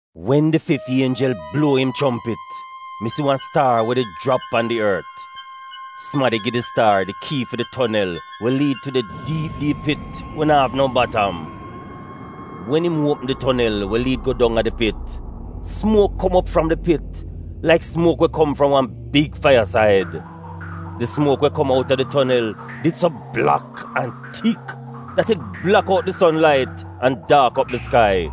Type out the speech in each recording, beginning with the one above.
Wen di fif ienjel bluo im chompit, mi si wan staar we did jrap pan di ort. Sumadi gi di staar di kii fi di tonel we liid tu di diip diip pit we no av no batam. Wen im uopm di tonel we liid go dong a di pit, sumuok kom op fram di pit laik sumuok we kom fram wan big faiya-said. Di sumuok we kom outa di tonel did so blak an tik dat it blak out di son lait an daak op di skai.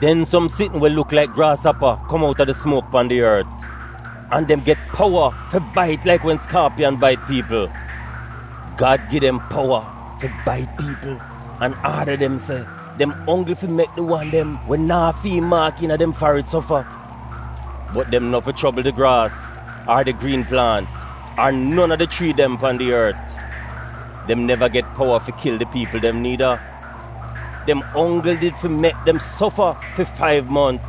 Den som sitn we luk laik graasapa kom outa di sumuok pan di ort. An dem get powa fi bait laik wen skaapiyan bait piipl. Gad gi dem powa fi bait piipl an aada dem se dem onggl fi mek di wan dem we no av fi im maak iina dem farid sofa. Bot dem no fi chobl di graas, ar di griin plaant, ar non a di chrii dem pan di ort. Dem neva get powa fi kil di piipl dem niida. Dem onggl did fi mek dem sofa fi faiv mont.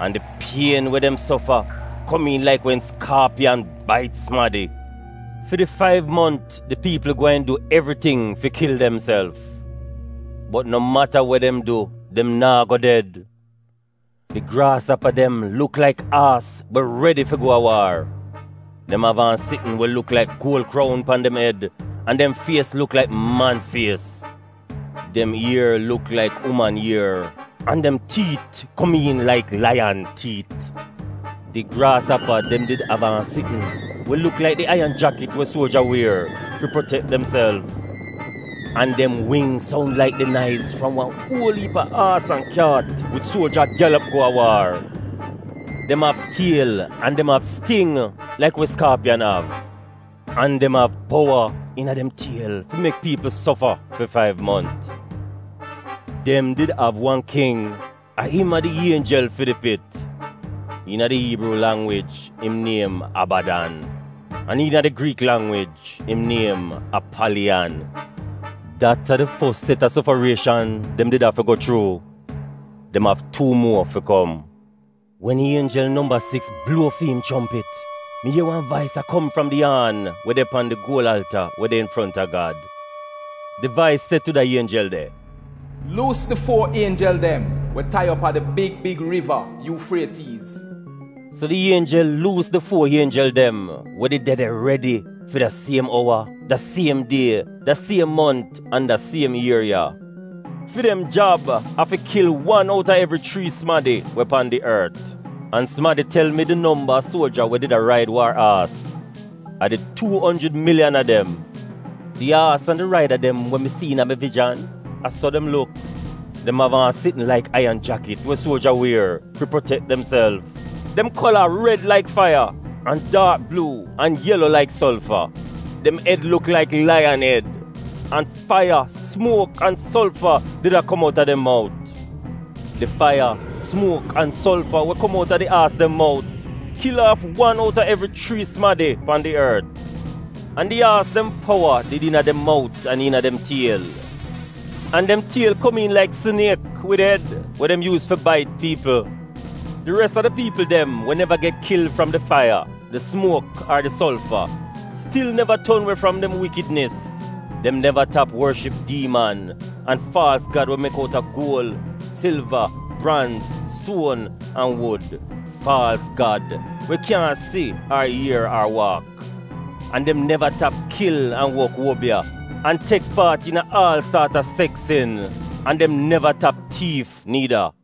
An di pien we dem sofa komiin laik wen skaapiyan bait sumadi. Fi di faiv mont di piipl gweehn du evriting fi kil demself. Bot no mata we dem du dem naa go ded. Di graasapa dem luk laik aas we redi fi go a waar. Dem av aan sitn we luk laik guol kroun pan dem ed an dem fies luk laik man fies. Dem ier luk laik uman ier, an dem tiit komiin laik laiyan tiit. Di graasapa dem did av aan sitn we luk laik di aiyan jakit we suoja wier fi protek demself. An dem wing soun laik di naiz fram wan uol iip a aas an kyaat wid suoja a gyalop go a waar. Dem av tiel an dem av sting, laik we skaapiyan av. An dem av powa iina dem tiel fi mek piipl sofa fi faiv mont. Dem did av wan king. A im a di ienjel fi di pit. Iina di Iibruu langwij, im niem Abadan. An iina di Griik langwij im niem Apaliyan. Dat a di fos set a sofarieshan dem did afi go chuu. Dem av tuu muor fi kom. Wen ienjel nomba siks bluo fi im chompit, mi ier wan vais a kom fram di aan we de pan di guol alta we de infronta Gad. Di vais se tu da ienjel de, “Luus di fuo ienjel dem we tai op a di big big riva Yuufrietiiz.” So di ienjel luus di fuo ienjel dem we did de de redi fi da siem owa, da siem die, da siem mont an da siem ier ya. Fi dem jab a fi kil wan outa evri chrii sumadi we pan di ort. An sumadi tel mi di nomba a suoja we did a raid waar aas. A did tuu onjrid miliyan a dem. Di aas an di raida dem we mi si iina mi vijan, a so dem luk: dem av aan sitn laik aiyan jakit we suoja wier fi protek demself. Dem kola red laik faiya, an daak bluu, an yelo laik solfa. Dem ed luk laik laiyan ed, an faiya, sumuok, an solfa did a kom outa dem mout. Di faiya, sumuok, an solfa we kom outa di aas dem mout kil aaf wan outa evri chrii sumadi pan di ort. An di aas dem powa did iina dem mout an iina dem tiel. An dem tiel komiin laik siniek wid ed we dem yuuz fi bait piipl. Di res a di piipl dem we neva get kil fram di faiya, di sumuok, ar di solfa, stil neva ton we fram dem wikidnis. Dem neva tap worship diiman, an faalz gad we mek outa guol, silva, branz, stuon, an wud — faalz gad we kyaahn si ar ier ar waak. An dem neva tap kil an wok uobiya, an tek paat iina aal saat a seks sin, an dem neva tap tiif niida.